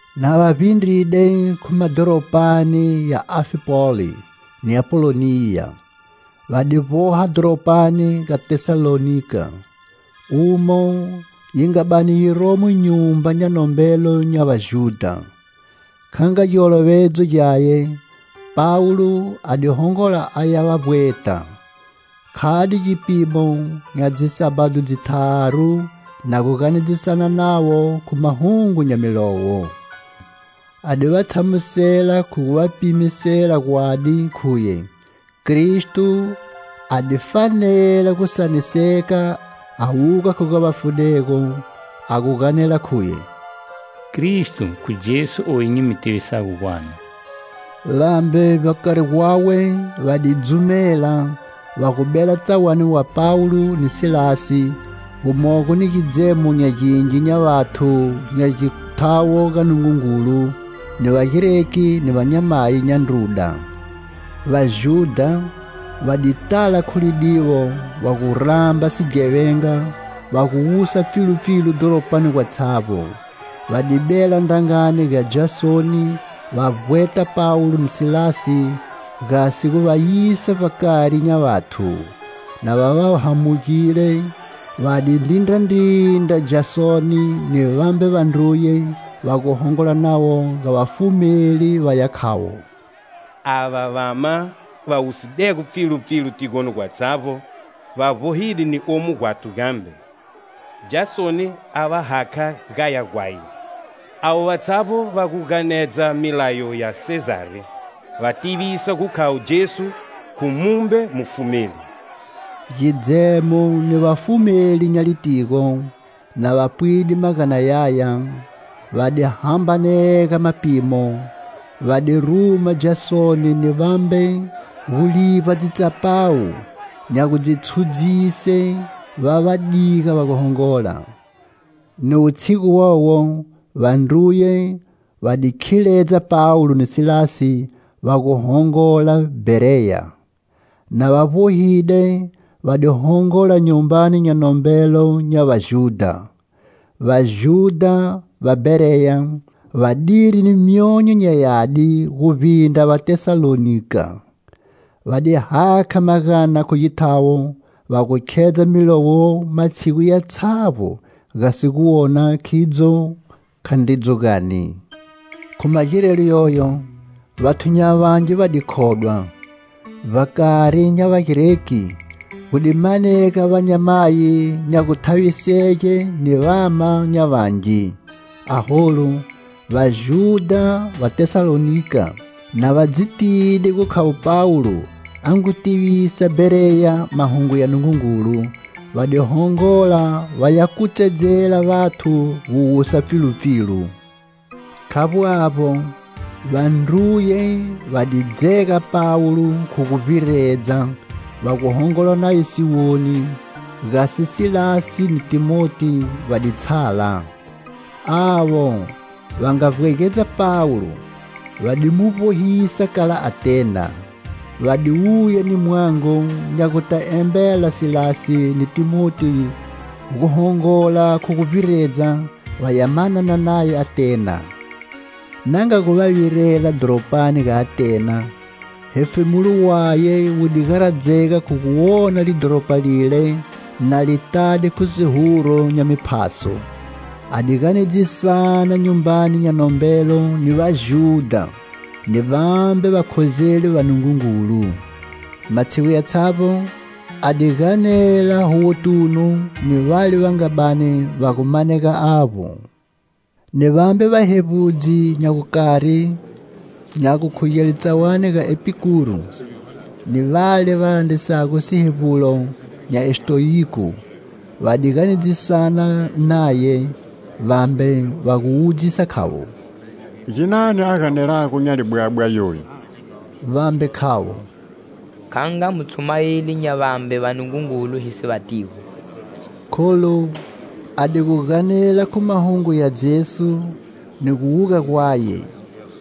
Na va vbindride khu madhoropani ya Anfipoli ni Apoloniya, va di vboha dhoropani ga Tesalonika, umo yi nga bani yi romo nyumba nya nombelo nya Vajudha. Kha nga giolovedzo gyaye, Pawulo a di hongola a ya va vbweta. Khade gipimo nya dzisabhado dzitharu na gu ganedzisana navo khu mahungu nya Milowo. A di va tshamusela khu gu va pimisela gwadi khuye Kristo a di fanela gu saniseka a wuga khu ga vafudego, a gu ganela khuye: "Kristo khu Jesu oyu nyi mu tivisago gwanu." Vambe vbakari gwawe va di dzumela, va gu bela tsawani wa Pawulo ni Silasi, gumogo ni gidzemo nya gingi nya vathu nya githawo ga Nungungulu, ni Vagreki ni vanyamayi nya ndruda. Vajudha va di tala khu lidiwo va gu ramba sighevenga, va gu wusa pfilupfilu dhoropani gatshavbo. Va di bela ndrangani ga Jasoni va vbweta Pawulo ni Silasi gasi gu va yisa vbakari nya vathu. Na va va hamugile, va di ndrindrandrindra Jasoni ni vambe vandruye va gu hongola navo ga vafumeli va ya khavo: "Ava vama va wusidego pfilupfilu tigoni gwatshavbo va vbohide ni omu gwathu gambe, Jasoni a va hakha gaya gwaye. Avo vatshavbo va gu ganedza milayo ya Sezari, va tivisa gu khavo Jesu khu mumbe mufumeli." Gidzemo ni vafumeli nya litigo, na va pwide magana yaya, va di hambanega mapimo, va di ruma Jasoni ni vambe gu livba dzitsapawu nya gu dzi tshudzise va va diga va gu hongola. Ni wutshigu wowo, vandruye va di khiledza Pawulo ni Silasi va gu hongola Bhereya. Na va vbohide va di hongola nyumbani nya nombelo nya Vajudha. Vajudha va Bhereya va diri ni myonyo nya yadi guvbindra va Tesalonika. Va di hakha magana khu githawo, va gu khedza Milowo matshigu yatshavbo gasi gu wona, khidzo, khandridzo gani. Khu magirelo yoyo, vathu nya vangi va di khodwa. Vbakari nya Vagreki gu di manega vanyamayi nya guthavisege ni vama nya vangi. Aholu, Vajudha va Tesalonika na va dzi tide gu khavo Pawulo a ngu tivisa Bhereya mahungu ya Nungungulu, va di hongola va ya kutsedzela vathu gu wusa pfilupfilu. Khavbo avbo, vandruye va di dzega Pawulo khu guvbiredza va gu hongola naye siwoni, gasi Silasi ni Thimoti va di tshala. Avo va nga vbwegedza Pawulo va di mu vbohisa kala Atena. Va di wuya ni mwango nya gu ta embela Silasi ni Thimoti gu hongola khu guvbiredza va ya manana naye Atena. Na nga gu va virela dhoropani ga Atena, hefemulo waye wu di garadzega khu gu wona lidhoropa lile na li tade khu sihuru nya miphaso. A di ganedzisana nyumbani nya nombelo ni Vajudha ni vambe vakhozeli va Nungungulu. Matshigu yatshavbo a di ganela huwotunu ni vale va nga bani va gu manega avbo. Ni vambe vahevbudzi nya gukari, nya gudugele tsawani ga Epikuru ni vale va landrisago sihevbulo nya Estoyiku, va di ganedzisana naye. Vambe va gu wudzisa, khavo: "Ginani a ganelago nya libwabwa yoyu?" Vambe khavo: "Kha nga mutshumayeli nya vambe vanungungulu hi si vatigo," kholu a di gu ganela khu mahungu ya Jesu ni gu wuga gwaye.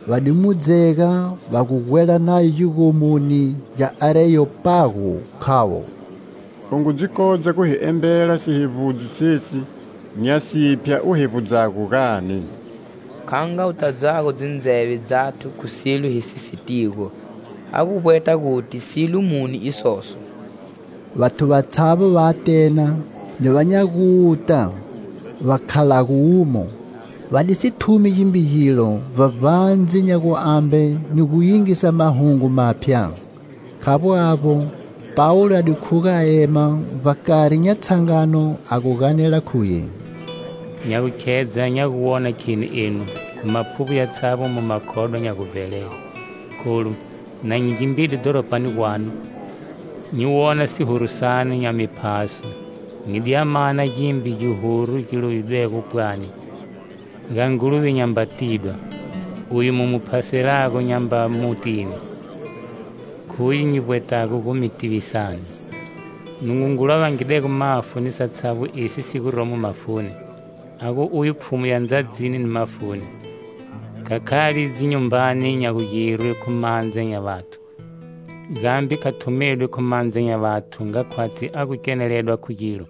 Va di mu dzega va gu gwela naye gigomoni gya Areyopagu, khavo: "U ngu dzi kodza gu hi embela sihevbudzo sesi nya siphya u hevbudzago, gani? Kha nga u tadzago dzindzeve dzathu khu silo hi si sitigo ha guvbweta guti silo muni isoso." Vathu vatshavbo va Atena ni va nya guta va khalago umo, va di si thumi gimbe gilo vbavbandze nya guambe ni gu yingisa mahungu maphya. Khavbo avbo, Pawulo a di khuga a ema vbakari nya tshangano a gu ganela khuye: "Nya gu khedza nya gu wona kheni enu, khu maphuvbo yatshavbo mu makhodwa nya guvbelele. Kholu, na nyi gimbide dhoropani gwanu, nyi wona sihuru sanu nya miphaso, nyi di ya mana gimbe gihuru gi lovidwego pwani: 'Ga Nguluve nyamba tidwa.' Uye mu mu phaselago nyamba mutini, khuye nyi vbwetago gu mi tivisani. Nungungulu a vangidego mafu ni satshavbo esi si guromo mafuni, a gu uye Pfhumu ya ndzadzini ni mafuni. Kha khali dzinyumbani nya gugirwe khu mandza nya vathu. Gambe kha thumedwi khu mandza nya vathu nga khwatshi a gu keneledwa khu gilo,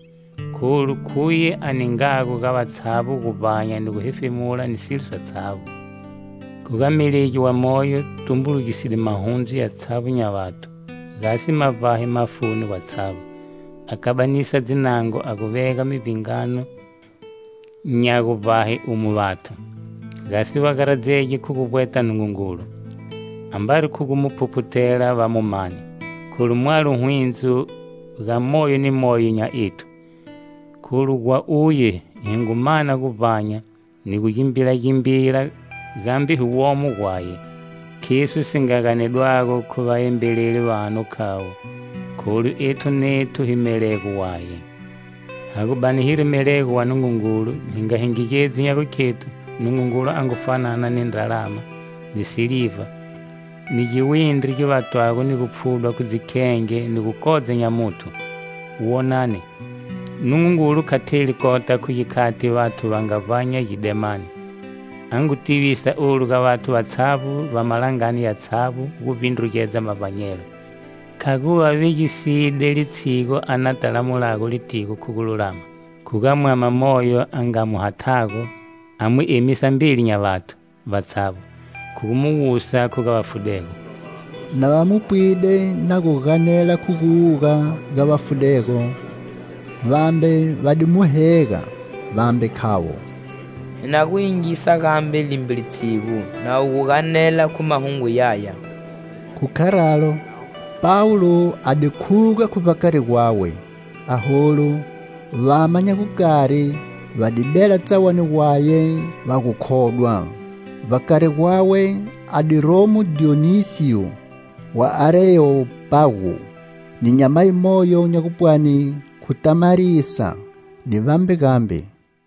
kholu khuye a ningago ga vatshavbo guvbanya ni guhefemula ni silo satshavbo. Khu ga melegi wa moyo, tumbulugiside mahundzu yatshavbo nya vathu, gasi ma vbahe mafuni gatshavbo; a kabanisa dzinango, a gu vega mivbingano nya guvbahe umo vathu. Gasi va garadzege khu guvbweta Nungungulu, ambari khu gu mu phuphuthela va mu mane; kholu mwalo hwindzo ga moyo ni moyo nya ethu. Kholu gwa uye hi ngu mana guvbanya, ni gu gimbilagimbila, gambe hi womo gwaye. Khiso si nga ganedwago khu vaembeleli vanu khavo: 'Kholu ethu nethu hi melego waye.' Ha gu bani hiri melego wa Nungungulu hi nga hingigedzi nya gukhethu Nungungulu a ngu fanana ni ndralama, ni siliva, ni giwindri gi vatwago ni gupfhudwa khu dzikhenge ni gu kodza nya muthu. Wonani, Nungungulu kha theli kota khu gikhati vathu va nga vbanya gidemani, a ngu tivisa olu ga vathu vatshavbo va malangani yatshavbo guvbindrugedza mavbanyelo. Khaguva vegiside litshigu a na ta lamulago litigo khu gululama, khu ga mwama moyo a nga mu hathago, a mu emisa mbeli nya vathu vatshavbo, khu gu mu wusa khu ga vafudego." Na va mu pwide na gu ganela khu gu wuga ga vafudego, vambe va di mu hega, vambe khavo: "Hi na gu yingisa gambe limbe litshigu na wu gu ganela khu mahungu yaya." Khu kharalo Pawulo a di khuga khu vbakari gwawe. Aholu, vama nya gukari va di bela tsawani gwaye va gu khodwa. Vbakari gwawe a di romo Dhiyonisiyo wa Areyopagu ni nyamayi moyo nya gupwani khu Tamarisa ni vambe gambe.